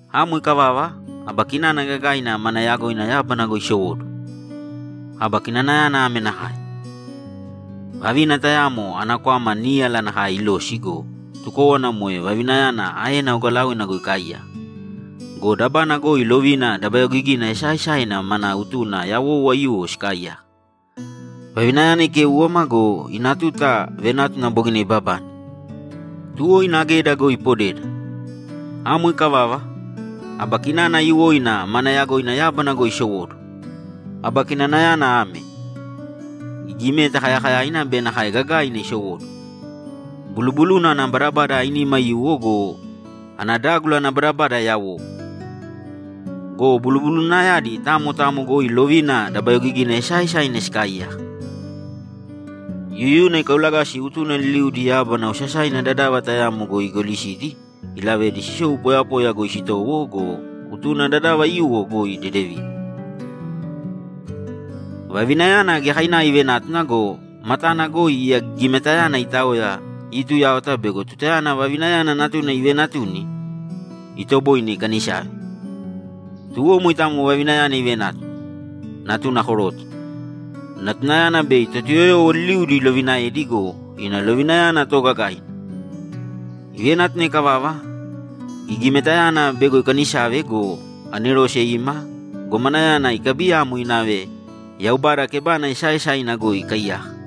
Amo ikavava, aba kinana gagaina mana yagoina yábana goi isowóduwo. Aba kinanayana ame nakae: Vavina tayamo ana kwama níyala nakae ilosi go, tukówana moe vavinayana aena ogalaoina goi ikaaiyaka. Go dabana goi lovina dabayogigina esaaesaina mana utuna yawou aiyuwo sikaaiyaka. Vavinayana ikéuwama go, ina tuta venátuna bogina ibabane, tuwo ina geda goi ipodeda. Amo ikavava, aba kinana aiyuwoina mana yagoina yábana goi isowóduwo. Aba kinanayana ame: Gigimeta kayakayaina be nakae gagaaina isowóduwo. Bulubuluna ana badabada ainima aiyuwo go, ana dágula ana badabada yawou. Go bulubulunayadi tamo tamo goi lovina dabayogigina esaaesaina sikaaiyaka. Yuyuna ikaulagasi utuna liliudi yábana osasaina dadava tayamo goi igolisidi, ilavedi sisou poyapoya goi sitowo go, utuna dadava aiyuwo goi dedevidi. Vavinayana giyakainava ivenátuna go, matana goi iya gigimetayana itaoya iituyáwata bego tutayana vavinayana natuna iveenatuni, itoboine ikanisave. Tuwo moitamo vavinayana ivenátuna, natuna koroto. Natunayana bei Totuyoyowo liliudi ilovinaedi go, ina lovinayana toogagaina. Ivenátuna ikavava, gigimetayana bego ikanisave go, anerose ima gomanayana ikabiyamo inave Yaubada kebana esaaesaina goi ikaaiyaka.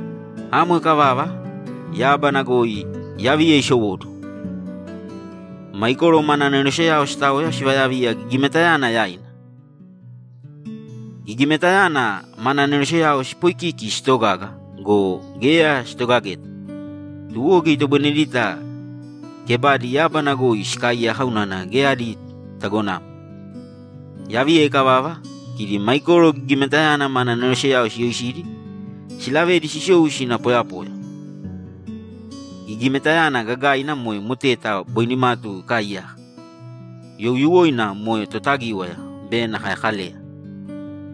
Amo ikavava, yábana goi yaviya isowóduwo. Maikoro mana aneroseyao sitaoya sivayaviya gigimetayana yaina. Gigimetayana mana aneroseyao sipoikiki sitogaga go, geya sitogageta, tuwo geya itoboinedita kebadi yábana goi sikaaiyaka unana geya adi tagonamo. Yaviya ikavava, kidi Maikoro gigimetayana mana aneroseyao siyoisidi, silavedi sisou sina poyapoya. Gigimetayana gagaina moe moteta boi nimatu ikaaiyaka. Youyuwoina moe Totagíwaya be nakae Kaleya.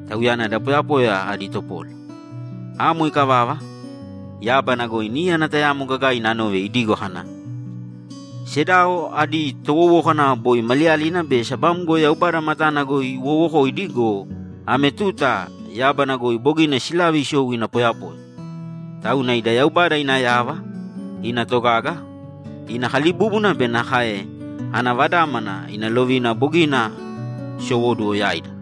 Tauyana da poyapoya adi topola. Amo ikavava, yábana goi níyana tayamo gagaina anove idigo kana, ‘Sedao adi towowókana boi maliyalina be sabamgo Yaubada matana goi iwoowokoidi go, ame tuta yábana goi bogina silave isou ina poyapoya! Tauna ida Yaubada ina yava, ina togaga, ina kalibúbuna be nakae ana Vadámana ina lovina bogina sisowóduwo yaida!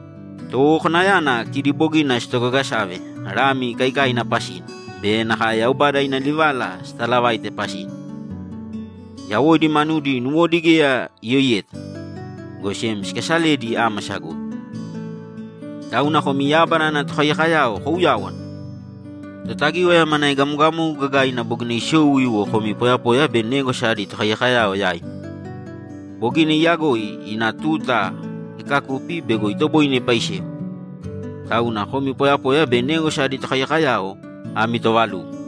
Towowokanayana kidi bogina sitogagasave Lami ikaikaina pasina be nakae Yaubada ina livala sitaalavaite pasina. Yawoidi manudi nuwodi geya iyoiyeta, go sem sikasaledi ámasa goi. Tauna komi yábana ana tokaiyakoyao kouyāwana! Totagíwaya mana egamogamogu gagaina bogina isou iwo komi poyapoya be négwasa adi tokaiyakoyao yaimi. Bogina iyagoi ina tuta ikakupi bego itoboine ipaisewa. Tauna komi poyapoya be négwasa adi tokaiyakoyao ami toovalugo!’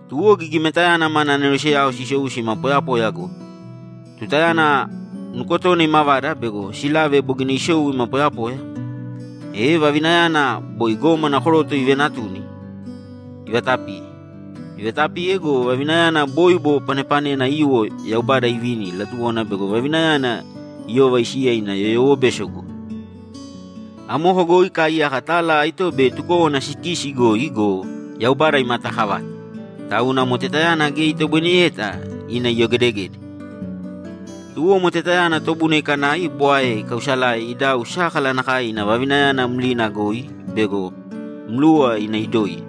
Tuwo gigimetayana mana aneroseyao sisou sima poyapoya goi. Tutayana nukotona imavada bego silave bogina isou ima poyapoya, e vavinayana boi gómana koroto ivenatuni, ivatapiye. Ivatapiye go, vavinayana bóibo panepanena aiyuwo sivini bego iyova isiya ina yoyowobeso goi. Amoko goi ikaaiyaka tala aito be tukówana sikisi goi go, Yaubada imataakavate, tauna motetayana geya itoboineyeta ina iyogedegede. Tuwo motetayana tobuna ikanai bwae ikausalave idau sákala nakae ina vavinayana mlina goi bego mluwa ina idoiye.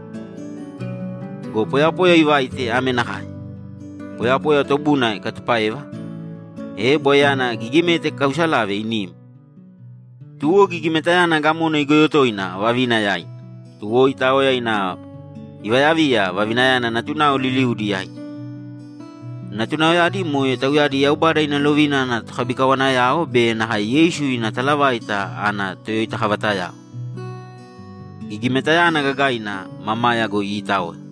Go poyapoya ivaite ame nakae: Poyapoya tobuna ikatupáeva, e bwaeyana gigimeta ikaausalave inim. Tuwo gigimetayana gamona igoyo toina vavina yaina. Tuwo itaoya ina ivayaviya vavinayana natunao liliudi yaidi. Natunaoyadi moe tauyadi Yaubada ina lovina adi tokabikawanayao be nakae Yeisu ina talavaita ana toyoitakavatayao. Gigimetayana gagaina mamaya goi iitaoya.